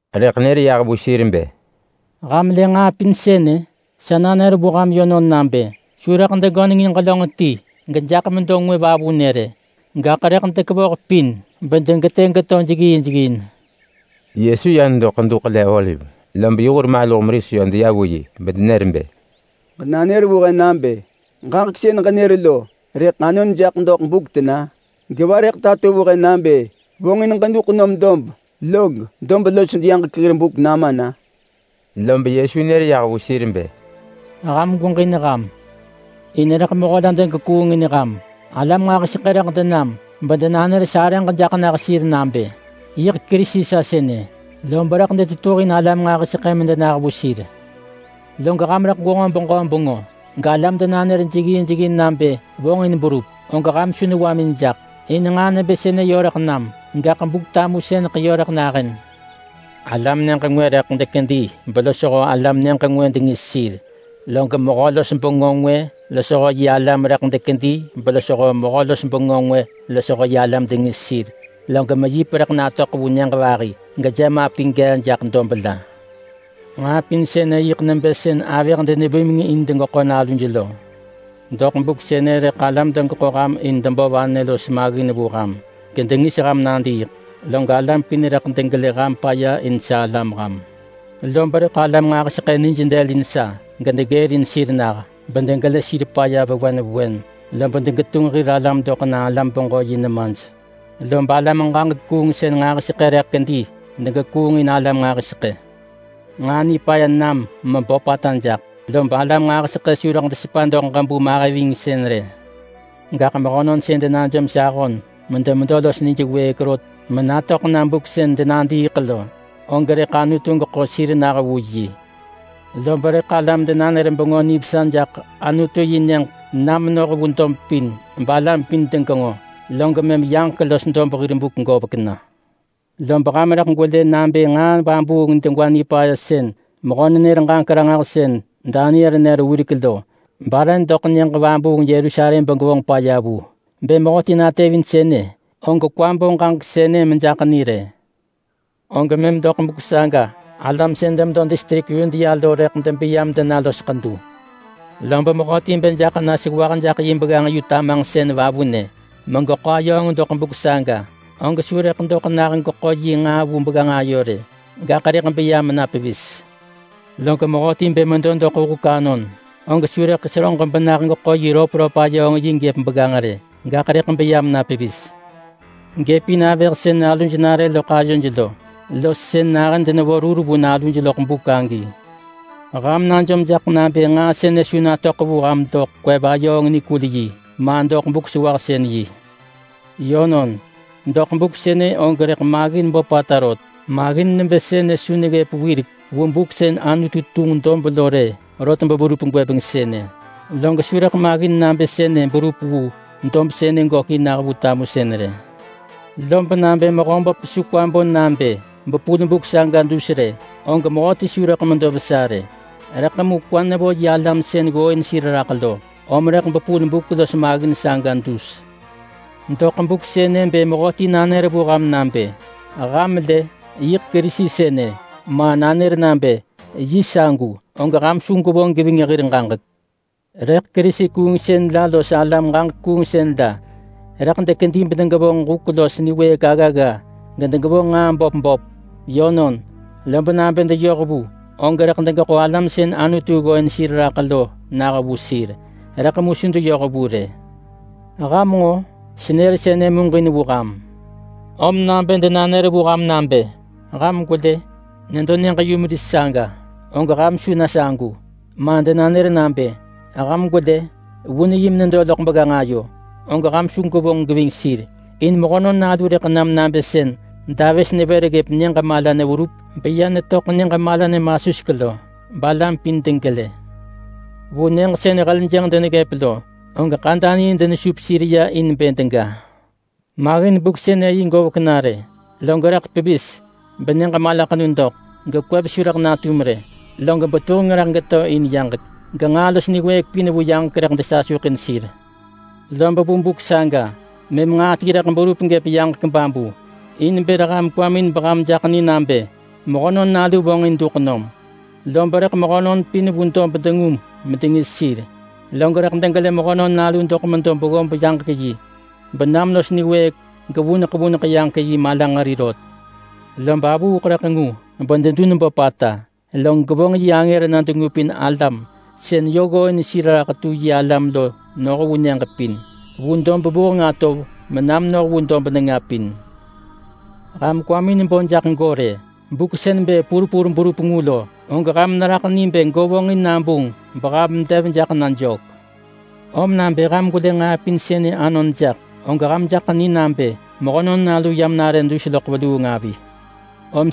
Rëḳ nër yah vu sir bë, “Ham lë nġaa pin sënë? Sa nanër vu ham yönon nabë: Su rëḳ degönengin ġelönġ ti gejaḳ medo ngwë vavunë rë. Gaḳ rëḳ dekevoh pin bedegetë geto jeggin jeggin.” Yesu ya nedo Ḳedu Ḳele-oliv, lob yi hur maluh meris yö deya vu yi bedenër bë, “Ġenanër vu he nabë ġaġek sën ġenër lo rëḳ anon jaḳ doḳ buk tena? Geva rëḳ tato vu he nabë vonġin ġeduḳ nom dob, log dob los yaġek hir buk nama na?” Lob Yesu nër yah vu sir bë, “Ham gweġin ham! In rëḳ mehö la degekuungin ham. Alam nġahiseḳë rëḳ denam bedenanër sarëġ jaḳ nah sir nabë, ‘Yiḳ Kerisi sa sënë!’ Lob rëḳ detetuhin alam nġahiseḳë medenah vu sir. Log ham rëḳ gwenġo beġö bengö, galam denanër jeggin jeggin nabë vonġin berup, og ham su newamin jaḳ! In nġaa nebë sënë yö rëḳ nam, gaḳ Buk-tamusëneḳ yö rëḳ nahën. Alam dob ngwë rëḳ dekedi belosho alam nyëġ ngwë dengis sir. Log mehö-los-bengö ngwë losho yi alam rëḳ dekedi belosho mehö-los-bengö ngwë losho yi alam dengis sir. Log meyip rëḳ natöḳ vu nyëġ vahi, gejemapi gee jaḳ dob la. Nġaa pin sënë og yiḳ nebë nivanë sën nevonġ avëh muġin in bë degeḳo naluj lo. Doḳ buk sënë rëḳ alam degeḳo ham in debo vanë los maggin vu ham, gedengis ham nadiiḳ. Log alam pin rëḳ degelë ham paya in sa alam ham. Lob rëḳ alam nġahiseḳë nij dëlin sa gedegërin sir nah, bedegelë sir paya, lob degetunġ hir alam doḳ na alam-beġö-yi nemaj. Lob alam-ġaġek-kuungsën nġahiseḳë rëḳ kedi degekuungin alam nġahiseḳë. Nġaa nipaya nam meböpata jaḳ, lob alam nġahiseḳë su rëḳ ahëj geving sir rë. Gaḳ mehönon sën denajom sa ahon medemedo los nij wëëk rot menatöḳ na buk sën denadiiḳ lo, og rëḳ Anutu geḳo sir nah vu yi. Lob rëḳ alam denanër Bengö Nivesa jaḳ Anutu-yi-Nyëġ na menoh vu dob pin balam pin degenġo, log mëm yaġek los dob hir buk govek na.” “Lob ham rëḳ gwelë nabë nġaa vabuung degwa nipaya sën mehö-nenër-ġaġek-ranġahsën Daniel nër wirek lo bare doḳ nyëġ vabuung Yerusalem begevonġ paya vu-bë mehöti natevin sënë, og kwa bo ġaġek sënë mejaḳ ni rë- og mëm doḳ buk saga alam sën demedo distrik Yudea lo rëḳ debeya bedena los ḳedu. Lob mehöti bë jaḳ na sewah jaḳ yi begganġ yu tamanġsën vavunë megeḳo ayööng doḳ buk saga, og su rëḳ doḳ nah geḳo yi nġaa vu begganġ ayo rë, gaḳ rëḳ beya mena pevis. Log mehöti bë medo doḳ huk anon, og su rëḳ seröġ benah geḳo yi röpröp-ayööng-yi gëp begganġ rë, gaḳ rëḳ beya mena pevis. Gëp in avëh sën naluj nare loḳ ayoj lo, los sën nahën denevo rur vu naluj loḳ buk agi. Ham najom jaḳ nabë nġaa sënë su natöḳ vu ham doḳ kwev-ayööng-nikul-yi, ma doḳ Buk-sewahsën-yi rë. Yönon, doḳ buk sënë og rëḳ maggin böpata rot. Maggin nebë sënë su neggëp wirek vu buk sën Anutu tunġ dob lo rë rot beverup gwëbeng sënë. Log su rëḳ maggin nabë sënë berup vu dob sënë gökin nah vu tamusën rë. Lob nabë Mehöböp su kwa bo nabë bepul buk saga dus rë, og mehöti su rëḳ medo vesa rë. Rëḳ mu kwa nevo yi alam sën ggooin sir raḳ lo, om rëḳ bepul buk los maggin saga dus. Doḳ buk sënë bë mehöti nanër vu ham nabë, ‘Ham lë! Yiḳ Kerisi sënë!’, ma nanër nabë, ‘Yi sagu!’, og ham su gwevonġ geving hir ġaġek. Rëḳ Kerisi-kuungsën la los alam-ġaġek-kuungsën la rëḳ dekedi bedegevonġ huk los niwëëk aggagga gedegevonġ nġaa böp böp. Yönon, lob nabë deyoh vu, og rëḳ degeḳo alam sën Anutu ggooin sir raḳ lo nah vu sir. Rëḳ mu su deyoh vu rë. Ham nġo? Senër sënë muġin vu ham! Om nabë denanër vu ham nabë, ‘Ham gwelë! Nedo nyëġ-yumeris saga!’, og ham su na sagu. Ma denanër nabë, ‘Ham gwelë! Vun yi menedo loḳ begganġ ayo!’, og ham su gwevonġ geving sir, in Mehönon Nalu rëḳ nam nabë sën davës nevër ggëp nyëġ mala neverup beya netöḳ nyëġ mala nemasuseḳ lo, balam pin degelë. Vu nyëġ sën heljënġ deneggëp lo, og ḳadanii denesup sir ya in bë dega.” “Maggin buk sënë yi govek na rë, log rëḳ pevis ‘benyëġ malaḳenu doḳ, gekwev su rëḳ natum rë, log betuheng rëḳ geto in yaġek. Genġaa los niwëëk pin vu yaġek rëḳ desasuḳin sir.’ Lob vu buk saga, mëm nġaa ti rëḳ berup gëp yaġek babu in bër ham kwamin beham jaḳ ni nabë Mehönon Nalu vonġin duḳ nom, lob rëḳ mehönon pin vu dob dengu medengis sir. Log rëḳ degelë Mehönon Nalu doḳ medo beggob yaġek yi, benam los niwëëk gevuneḳ vuneḳ yaġek yi malanġeri rot. Lob avuuḳ rëḳ ngu bededun böpata, log gevonġ yi angër na dengupin alam sën yö ggooin sir raḳ tu yi alam lo noh vu nyëġ pin. Vu dob vuheng atov mena menoh vu dob nenga lubeluu.” “Ham kwamin bo jaḳ go rë. Buk sën bë purpur berup ngu lo, og ham neraḳ ni bë go vonġin nabunġ beham dev jaḳ na jök. Om nabë ham gwelë nġaa pin sënë anon jaḳ, og ham jaḳ ni nabë Mehönon Nalu yam dus raḳ benare aggata avi.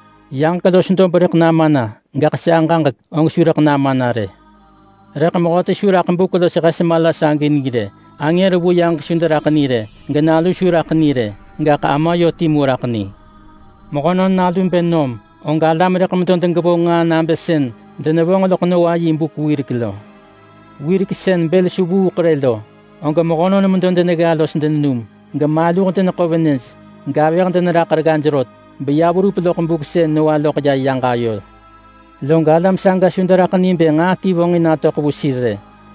Yaġek los dob rëḳ nama na, gaḳ sa ġaġek, og su rëḳ nama na rë.” “Rëḳ mehöti su raḳ buk los hes mala saga ni rë. Angër vu yaġek su deraḳ ni rë. GeNalu su raḳ ni rë. Gaḳ Ama yö timu raḳ ni. Mehönon Nalu bë nom, og alam rëḳ medo degevonġ nġaa nabë sën denevonġ loḳ Noa yi buk wirek lo. Wirek sën bël su vuuḳ rë lo, og mehönon medo denegga los denenum, gemaluh deneḳo venëj, gavëh deneraḳ reggaj rot, beya verup loḳ buk sën Noa loḳ ya yaġ ayo. Log alam saga su deraḳ ni bë nġaa ti vonġin natöḳ vu sir rë,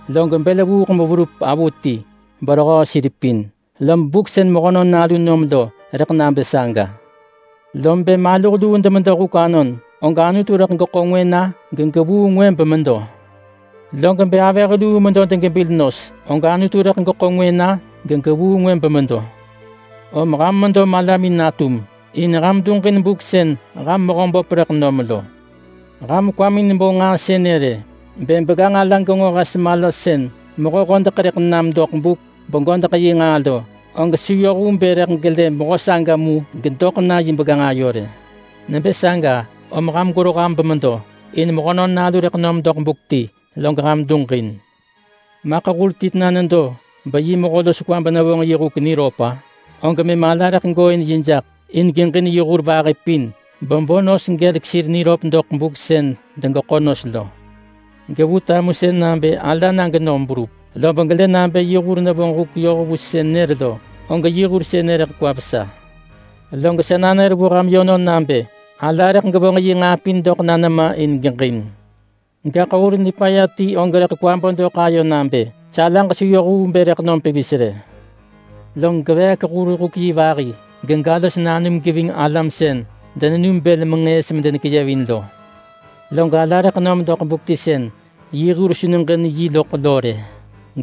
log bël vuuḳ verup pevis berehöö sir pin. Lob buk sën Mehönon Nalu nom lo rëḳ nabë saga. Lob bë maluh luu demedo huk anon, og Anutu rëḳ geḳo ngwë na gegevuu ngwë bemedo. Lob bë avëh luu medo degebil nos, og Anutu rëḳ geḳo ngwë na gegevuu ngwë bemedo. Om ham medo malamin natum, in ham duġin buk sën ham Mehöböp rëḳ nom lo. Ham kwamin bo nġaa sënë rë: Bë begganġ ala genġo hes mala sën mehö hodeḳ rëḳ nam doḳ buk begodeḳ yi nġaa lo, og su yoh vu bë rëḳ gelë mehö saga mu gedoḳ na yi begganġ ayo rë. Nebë saga, om ham gwero ham bemedo, in Mehönon Nalu rëḳ nom doḳ buk ti, log ham duġin.” “Maḳ hur ti tena nedo beyi mehö los kwa benevonġ yi huk niröp-a? Og mëm ala rëḳ gooin yi jaḳ in geġin yi hur vahi pin bebo nos gelek sir niröp doḳ buk sën degeḳo nos lo. Gevu tamusën nabë ala na genom berup, lob gelë nabë yi hur nevonġ huk yoh vu sën nër lo, og yi hur sënë rëḳ kwa vesa. Log sa nanër vu ham yönon nabë ala rëḳ gevonġ yi nġaa pin doḳ na nema in geġin. Gaḳ hur nipaya ti og rëḳ kwa bo doḳ ayo nabë, ‘Sa alaġ su yoh vu bë rëḳ nom pevis rë!’ Lob geveek hur-huk-yi vahi, gega los nanum geving alam sën denenum bël menġëës bedenekeyevin lo. Log ala rëḳ nom doḳ buk ti sën yi hur su neġin yi loḳ lo rë,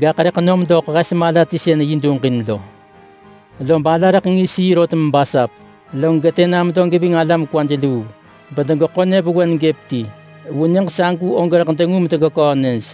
gaḳ rëḳ nom doḳ hes mala ti sën yi duġin lo. Lob rëḳ ala ngis yi rot mebasap yi, log getë na medo geving alam kwaj luu, bedegeḳo nyëvewen gëp ti. Vu nyëġ sagu og rëḳ dengu medegeköö nyëj.”